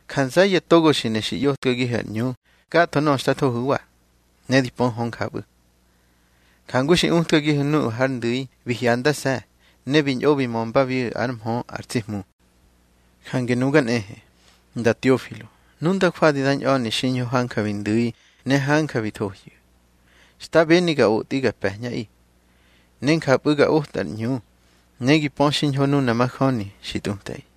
Ja nze̱ye̱ togo xi ne xi ꞌyotkagihu̱ ar ꞌñu gatho nöꞌö xta thohu̱wa, ne di pöhu̱ hö njapꞌu̱, njangu xi utkagihu̱ nuꞌu̱ hár ndu̱i bi hyandase̱, ne bi ñꞌo bi mömbabiꞌu̱ ár mhö ar tsi Hmu. Jange nuga nꞌehe, Nda Teofilo, nu nda jwadi da ñꞌa̱ni xiñho hanja bi ndu̱i ne hanja bi thohyu̱, xta beni ga otꞌi ga pe̱ñꞌaꞌi, ne njapꞌu̱ ga oꞌtꞌa ar ꞌñu, ne gi pö xiñho nuna majöni xi tꞌutꞌaꞌi.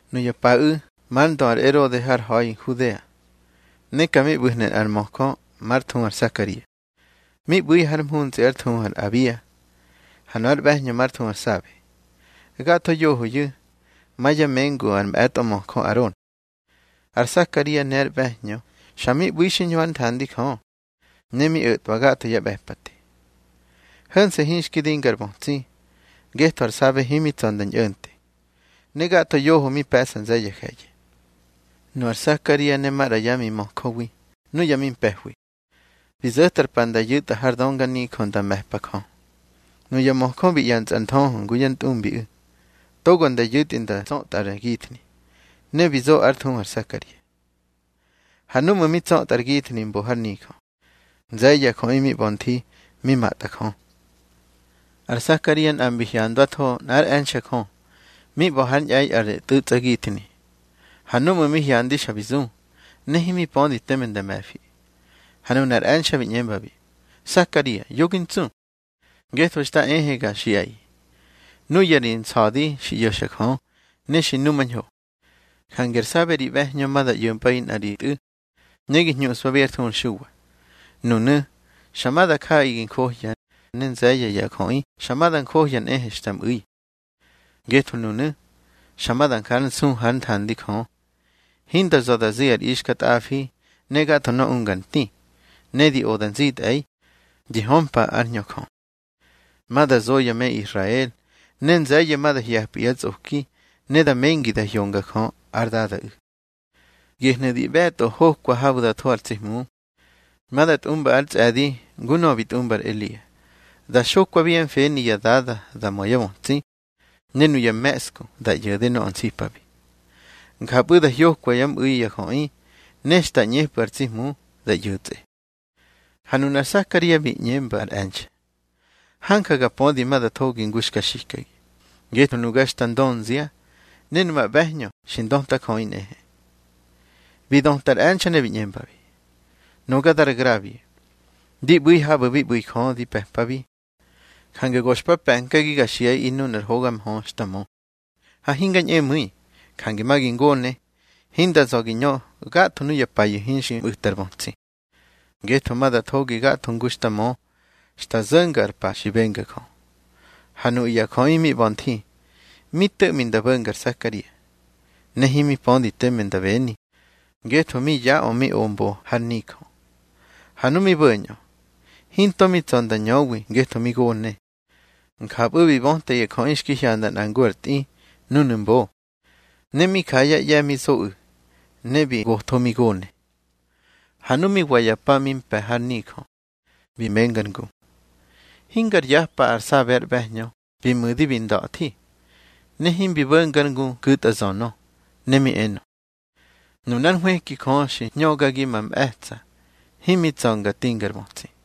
Nuya paꞌu̱ mar ndö ar Erode har ha̱i Nhudea, ne ka mi ꞌbu̱hnu̱ nꞌar möjö már thuhu ar Sakaria, mi ꞌbu̱ har mhuntsꞌi ár thuhu ar Abia. Ha nöꞌö ár ꞌbe̱hñö már thuhu ar Sabe. Gatho yohoyu̱ ma yá mengu ar mꞌe̱tꞌo möjö Aron. Ar Sakaria ne ár ꞌbe̱hñö xa mi ꞌbu̱i xiñho hár nthandi Jö, ne mi o̱twa gatho yá ꞌbe̱pate. Ho̱nse̱ hinxki dinga ar bötsi, ngetho ar Sabe himi tsa̱ nda ñꞌo̱nte, ne gatho yoho mi pe̱ꞌsa nze̱ye̱ ya je̱ye̱. Nu ar Sakaria ne maꞌra yá mimöjöwi nuya mi mpe̱hwi, bi zo̱tꞌar pa nda yu̱tꞌa har dönganijö nda me̱pa Jö. Nuya möjö bi ꞌye̱ntsꞌa ar nthöhö ngu yá ntꞌumbiꞌu̱, togo nda yu̱tꞌi nda tsötꞌa ar githni. Ne bi zo ár thuhu ar Sakaria. Ha núꞌmu̱ mi tsötꞌa ar githni mbo har nijö, nze̱ye̱ ya jöꞌi mi ꞌba̱ nthi mi matꞌa Jö. Ar Sakaria nꞌa mbi hyandwatho nꞌár e̱nxe̱ Jö mi ꞌba̱ hár ñꞌe̱i ar tꞌuꞌsgithni. Ha núꞌmu̱ mi hyandi xa bi zu, ne himi pödi teme nda me̱fi. Ha nunar e̱nxe̱ bi ꞌñembabi: —Sakaria, yo gi ntsu, ngetho xta ehe ga xiꞌaꞌi, nuya ri nsa̱di xi ꞌyo̱xa Jö, ne xi numañho. Jange ar Sabe ri ꞌbe̱hñö ma da ꞌyo̱mpꞌaꞌi nꞌa ri tꞌu̱, ne gi hñuꞌspabi ár thuhu ar Xuwa. Nunu̱ xa ma da jaꞌaꞌi gi njohya, ne nze̱ye̱ ya jöꞌi xa ma da njohya nꞌehe xta mꞌu̱i. Ngetho nunu̱ xa ma da njár nsu hár nthandi Jö. Hinda za̱ da zi ar ixkatꞌafi ne gatho nöꞌö unga ar nti. Ne di oda nzitꞌe̱i, di hömpa ár Hñö Jö. Ma da zo ya me Israel, ne nze̱ye̱ ma da hye̱pꞌu̱ yá tsꞌoki, ne da mengi da hyonga Jö ár Dadaꞌu̱. Gehnu̱ di ꞌbe̱tꞌo hokwa habu̱ da tho ar tsi Hmu. Ma da tꞌumba ár tsꞌe̱di ngu nöꞌö bi tꞌumba ar Elia, da xokwabi yá mfeni ya dada da mö yá bötsi, ne nuya me̱ꞌsku da ꞌyo̱de nöꞌö nsipabi. Njapꞌu̱ da hyokwa yá mꞌu̱i ya jöꞌi, ne xta ꞌñepꞌu̱ ar tsi Hmu da ꞌyo̱tsꞌe. Ha nuna ar Sakaria bi ꞌñemba ar e̱nxe̱: —Hanja ga pödi ma da thogi ngu xka xikagi. Ngetho nuga xta ndönzia, ne numa ꞌbe̱hñö xi ndötajöꞌi nꞌehe. Bi döta ar e̱nxe̱ ne bi ꞌñembabi: —Nuga dar Grabie, di ꞌbu̱i habu̱ bi ꞌbu̱ Jö di pe̱pabi. Jange go xpa pe̱nkagi ga xiꞌaꞌi nunar hoga mhö xta mö. Ha hinga ñꞌemu̱i, jange ma gi ngone, hinda za̱ gi ñö gatho nuya payu̱ hinxi mꞌu̱ta ri bötsi. Ngetho ma da thogi gatho ngu xta mö xta zo̱nga ar pa xi benga Jö. Ha nuꞌu̱ ya jöꞌi mi ꞌba̱ nthi, mi to̱ꞌmi nda bo̱nga ar Sakaria. Ne himi pödi teme nda beni, ngetho mi yaꞌö mi o mbo har nijö. Ha nu mi bo̱ñꞌö, hinto mi tsa̱ nda ñöwi ngetho mi gone. Njapꞌu̱ bi böta ya jöꞌi xki hyanda nꞌa ngu ar tꞌi núnu̱ mbo. Ne mi ja yá ꞌye̱ mi zoꞌu̱, ne bi gotho mi gone. Ha nu mi wa ya pa mi mpe̱ har nijö, bi menga ár ngu. Hingar yapa ar Sabe ár ꞌbe̱hñö bi mu̱di bi nda̱thi, ne himbi bo̱ngár ngu ku̱tꞌa nzönö. Ne mi enö: Nunár hwëki Jö xi hñögagi ma mꞌe̱tsa̱ himi tsa̱ nga tingar bötsi.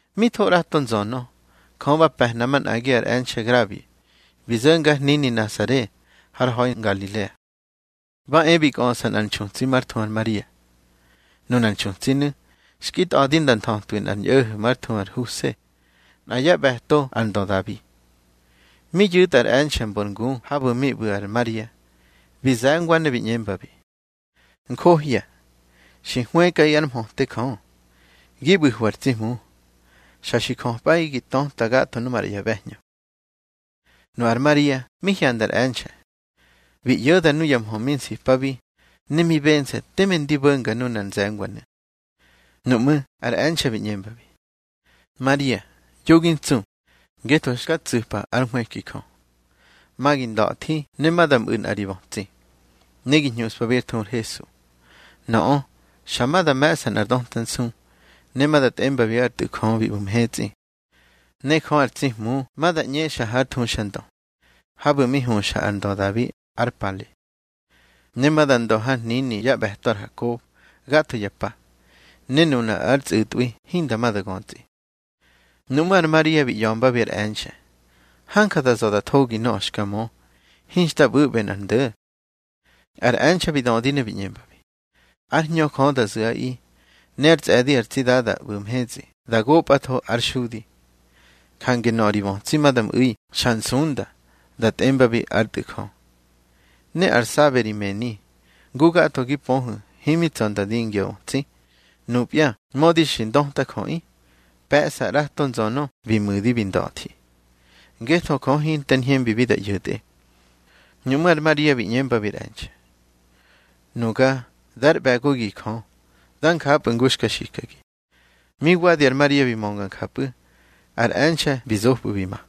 Mi tho ꞌrato nzönö, Jö ba pe̱hna manꞌagi ar e̱nxe̱ Grabie, bi zo̱nga har hnini Nasare har ha̱i Ngalilea. Ba e bi kꞌöꞌsa nꞌar nxutsi már thuhu Maria. Nunar nxutsinu̱ xki tꞌa̱di nda nthötwi nꞌar ñꞌo̱ho̱ már thuhu ar Huse, nꞌa yá ꞌbe̱to ar ndö Dabi. Mi yu̱tꞌa ar e̱nxe̱ mbor ngu habu̱ mi ꞌbu̱ ar Maria, bi ze̱ngwa ne bi ꞌñembabi: —Njohya, xi hwëkꞌaꞌi ár mhöte Jö. Gi ꞌbu̱hwi ar tsi Hmu. Xa xi jöpꞌaꞌi gi töta gatho maꞌra ya ꞌbe̱hñö. Nu ar Maria mi hyanda ar e̱nxe̱, bi ꞌyo̱da nuya mhö mi nsipabi, ne mi bense̱ teme ndi bo̱nga nunar nze̱ngwanu̱. Nuꞌmú̱ ar e̱nxe̱ bi ꞌñembabi: —Maria, yo gi ntsu, ngetho xka tsu̱pa ár nhwëki Jö. Ma gi nda̱thi ne ma da mꞌu̱ nꞌa ri bötsi, ne gi hñuꞌspabi ár thuhu ar HESU. Nöꞌö xa ma da me̱ꞌsa nꞌar döta nsu, ne ma da tꞌembabi ár Tꞌu̱ Jö bi ꞌbu̱ mhetsꞌi. Ne Jö ar tsi Hmu ma da ꞌñexa hár thuxandö, habu̱ mi huxa ar ndö Dabi ár pale. Ne ma da ndö hár hnini yá ꞌbe̱to ar Hakob gatho ya pa, ne nuna ár tsꞌu̱tꞌwi hinda ma da götsꞌi. Nuꞌmú̱ ar Maria bi ꞌya̱mbabi ar e̱nxe̱: —Hanja da za̱ da thogi nöꞌö xka mö. Hinxta ꞌbu̱ꞌbe nꞌar ndo̱. Ar e̱nxe̱ bi dödi ne bi ꞌñembabi: —Ár Hñö Jö da zu̱ꞌaꞌi, ne ár tsꞌe̱di ar tsi Dada ꞌbu̱ mhetsꞌi da gopꞌatho ár xudi. Jange nöꞌö ri bötsi ma da mꞌu̱i xa nsunda, da tꞌembabi ár Tꞌu̱ Jö. Ne ar Sabe ri mëni, ngu gatho gi pöhu̱ himi tsa̱ nda dingya bötsi, nupya mödi xi ndötajöꞌi, pe̱ꞌsa ꞌrato nzönö bi mu̱di bi nda̱thi. Ngetho Jö hinter ñhembibi da ꞌyo̱tꞌe. Nuꞌmú̱ ar Maria bi ꞌñembabi ar e̱nxe̱: —Nuga dár ꞌbe̱gogi Jö. Da njapꞌu̱ ngu xka xikagi. Mi wa ar Maria bi mönga njapꞌu̱, ar e̱nxe̱ bi zopꞌu̱ bi ma.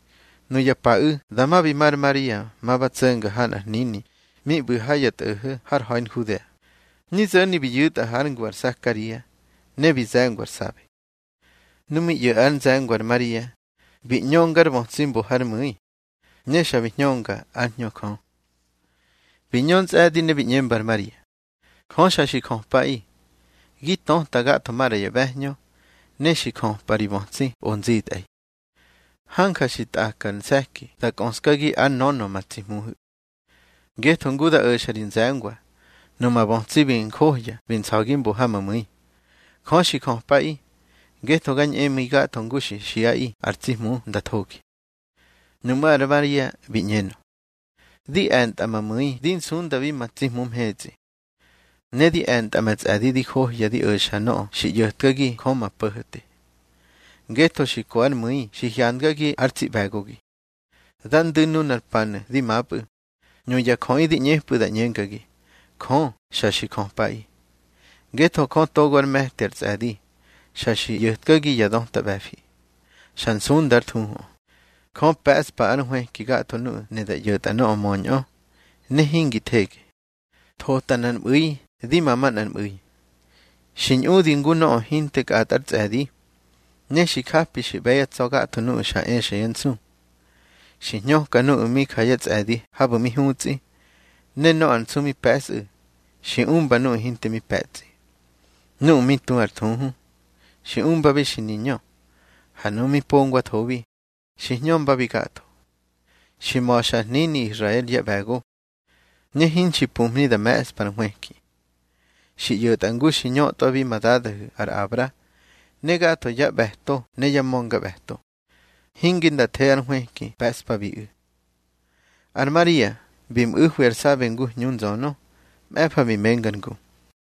Nuya paꞌu̱ dama bi ma ar Maria, ma ba tso̱nga ha nꞌar hnini mi ꞌbu̱ ha ya tꞌo̱ho̱ har ha̱i Nhudea. Mi zo̱ni bi yu̱tꞌa hár ngu ar Sakaria, ne bi ze̱ngwa ar Sabe. Nu mi ꞌyo̱ ár nze̱ngwa ar Maria, bi ꞌñönga ár bötsi mbo hár mu̱i, ne xa bi hñönga ár Hñö Jö. Bi ñö ntsꞌe̱di ne bi ꞌñemba ar Maria: —Jö xa xi jöpꞌaꞌi, gi töta gatho maꞌra ya ꞌbe̱hñö, ne xi jöpꞌa ri bötsi o nzitꞌe̱i. Hanja xi tꞌakar se̱ki da kꞌöskagi ár nönö ma tsi Hmuhu̱. Ngetho ngu da o̱xa ri nze̱ngwa, numa bötsi bi njohya bi nsa̱gi mbo ha ma mu̱i. Jö xi jöpꞌaꞌi, ngetho ga ñꞌemu̱i gatho ngu xi xiꞌaꞌi ar tsi Hmu nda thogi. Nuꞌmú̱ ar Maria bi ꞌñenö: Di e̱ntꞌa ma mu̱i di nsundabi ma tsi Hmu mhetsꞌi. Ne di e̱ntꞌa ma tsꞌe̱di di johya di o̱xa nöꞌö xi ꞌyo̱tkagi Jö ma Po̱ho̱te. Ngetho xi ko ár mu̱i xi hyandgagi ár tsi ꞌbe̱gogi. Da ndu̱ nunar panu̱ di mapꞌu̱, nuya jöꞌi di ꞌñepꞌu̱ da ꞌñengagi, Jö xa xi jöpꞌaꞌi. Ngetho Jö togo ár me̱ti ar tsꞌe̱di, xa xi ꞌyo̱tkagi ya döta ꞌbe̱fi. Xa nsunda ár thuhuꞌö. Jö pe̱ꞌspa ar nhwëki gatho nuꞌu̱ ne da ꞌyo̱tꞌa nöꞌö möñꞌö, ne hingi thege, thota nꞌar mꞌu̱i di ma manꞌar mꞌu̱i. Xi ñꞌudi ngu nöꞌö hinte kꞌatꞌa ár tsꞌe̱di. Ne xi japi xi ꞌbe̱ yá tsa̱ gatho nuꞌu̱ xa exa yá nsu. Xi hñöka nuꞌu̱ mi ja yá tsꞌe̱di habu̱ mi hutsꞌi, ne nöꞌö ar nsu mi pe̱sꞌu̱, xi umba nuꞌu̱ hinte mi pe̱tsꞌi. Nuꞌu̱ mi tu ar thuhu, xi umbabi xi niñö, ha nuꞌu̱ mi pongwathobi, xi hñömbabi gatho. Xi ma̱xa ár hnini Israel yá ꞌbe̱go, ne hinxi pumhni da me̱ꞌspa ar nhwëki. Xi ꞌyo̱tꞌa ngu xki ñötꞌwabi ma dadahu̱ ar Abra, ne gatho yá ꞌbe̱to ne yá ma̱ngaꞌbe̱to; hinge nda the ár nhwëki pe̱ꞌspabiꞌu̱. Ar Maria bi mꞌu̱hwi ar Sabe ngu hñu nzönö. Mꞌe̱fa bi menga ár ngu.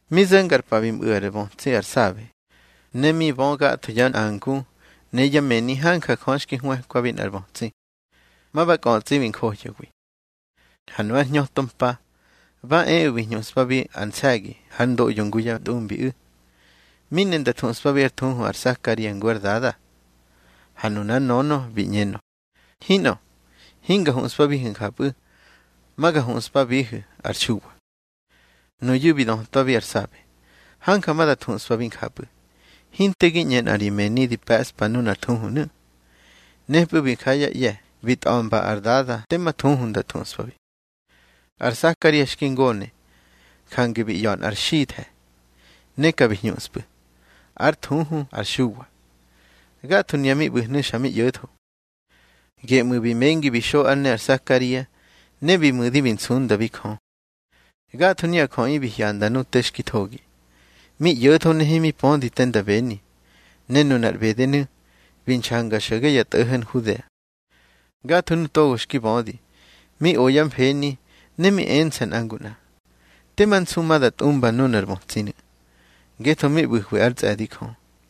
Mi zo̱nga ar pa bi mꞌu̱ ár bötsi ar Sabe. Ne mi bö gatho yá nꞌangu ne yá mëni hanja Jö xki hwëkwabi nꞌar bötsi, ma ba kꞌötsꞌi bi njohyawi. Ha nu ár hñöto mpa, ba eꞌu̱ bi hñuꞌspabi ar nse̱gi hár ndoꞌyo ngu yá ntꞌumbiꞌu̱. Mi ne nda thuꞌspabi ár thuhu ar Sakaria ngu ár dada. Ha nunár nönö bi ꞌñenö: —Hinꞌö, hinga huꞌspabihu̱ njapꞌu̱. Ma ga huꞌspabihu̱ ar Xuwa. Nuyu̱ bi dötwabi ar Sabe: —Hanja ma da thuꞌspabi njapꞌu̱. Hinte gi ꞌñe nꞌa ri mëni di pe̱ꞌsa nunar thuhunu̱. Nepꞌu̱ bi ja yá ꞌye̱ bi tꞌa̱mba ár dada tema thuhu nda thuꞌspabi. Har Sakaria xki ngone, jange bi ꞌya̱ nꞌar xithe̱, ne ka bi hñuxpꞌu̱: Ár thuhu ar Xuwa. Gatho nuya mi ꞌbu̱hnu̱ xa mi ꞌyo̱tho. Geꞌmu̱ bi mengi bi xo ár ne ar Sakaria, ne bi mu̱di bi nsundabi Jö. Gatho nuya jöꞌi bi hyanda nu te xki thogi, mi ꞌyo̱tho ne himi pödi te nda beni. Ne nunar ꞌbedenu̱ bi nxanga xo̱ge ya tꞌo̱ho̱ Nhudea. Gatho nu togo xki bödi, mi o yá mfeni, ne mi ense̱ nꞌa ngu nꞌa: —Tema nsu ma da tꞌumba nunar bötsinu̱. Ngetho mi ꞌbu̱hwi ár tsꞌe̱di Jö.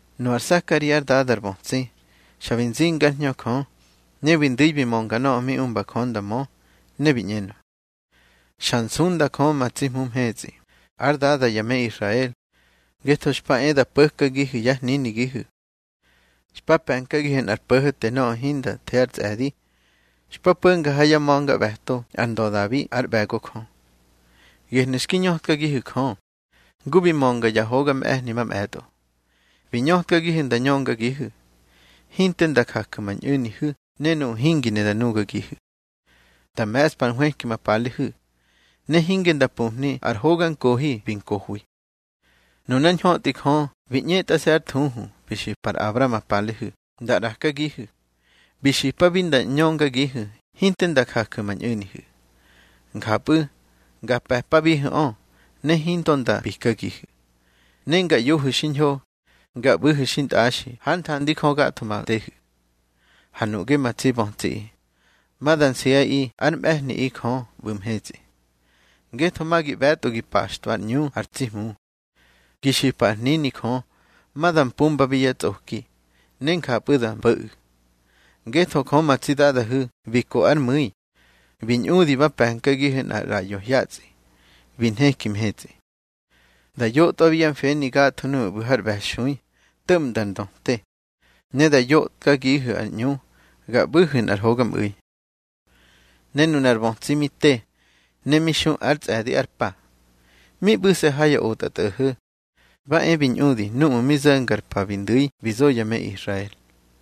Nu ar Sakaria ár dada ar bötsi, xa bi zinga ár Hñö Jö, ne bi ndu̱i bi mönga nöꞌö mi umba Jö nda mö, ne bi ꞌñenö: Xa nsunda Jö ma tsi Hmu mhetsꞌi, ár Dada ya me Israel, ngetho xpa e da po̱kagihu̱ yá hninigihu̱. Xpa pe̱nkagihu̱ nꞌar Po̱ho̱te nöꞌö hinda the ár tsꞌe̱di, xpa po̱nga ha yá ma̱ngaꞌbe̱to ar ndö Dabi ár ꞌbe̱go Jö. Gehnu̱ xki ñötkagihu̱ Jö, ngu bi mönga yá hoga mꞌe̱hni mamꞌe̱tꞌo. Bi ñötkagihu̱ nda ñöngagihu̱, hinte nda jaju̱ ma ñꞌu̱nihu̱ ne nuꞌu̱ hingi ne da nugagihu̱. Nda me̱ꞌspa ar nhwëki ma palehu̱, ne hinge nda pumhni ár hoga nkohi bi nkohwi. Nunár ñhötꞌi Jö bi ꞌñetꞌase̱ ár thuhu, bi xipa ar Abra ma palehu̱, nda ꞌrakagihu̱. Bi xipabi nda ñöngagihu̱ hinte nda jaju̱ ma ñꞌu̱nihu̱, njapꞌu̱ nga pe̱pabihu̱ꞌö, ne hinto nda pikagihu̱. Ne nga ꞌyohu̱ xiñho, nga ꞌbu̱hu̱ xintꞌaxi hár nthandi Jö gatho ma tehu̱. Ha nuꞌge ma tsi bötsiꞌi, ma da nsiꞌaꞌi ár mꞌe̱hniꞌi Jö ꞌbu̱ mhetsꞌi, ngetho ma gi ꞌbe̱tꞌo gi paxtꞌwa ár ꞌñu ar tsi Hmu. Gi xipa ár hnini Jö ma da mpumbabi yá tsꞌoki, ne njapꞌu̱ da mpo̱ꞌu̱. Ngetho Jö ma tsi Dadahu̱ bi ko ár mu̱i, bi ñꞌudi ba pe̱nkagihu̱ nꞌar ꞌraꞌyo hyatsꞌi bi nheki mhetsꞌi, da yotꞌwabi yá mfeni gatho nuꞌu̱ ꞌbu̱ har ꞌbe̱xui, to̱ꞌmda ar ndöte. Ne da yotkagihu̱ ar ꞌñu ga ꞌbu̱hu̱ nꞌar hogamꞌu̱i. Ne nuna ar bötsi mi te ne mi xu ár tsꞌe̱di ár pa. Mi ꞌbu̱se̱ ha ya otꞌatꞌo̱ho̱. Ba e bi ñꞌudi núꞌmu̱ mi zo̱nga ar pa bi ndu̱i bi zo ya me Israel.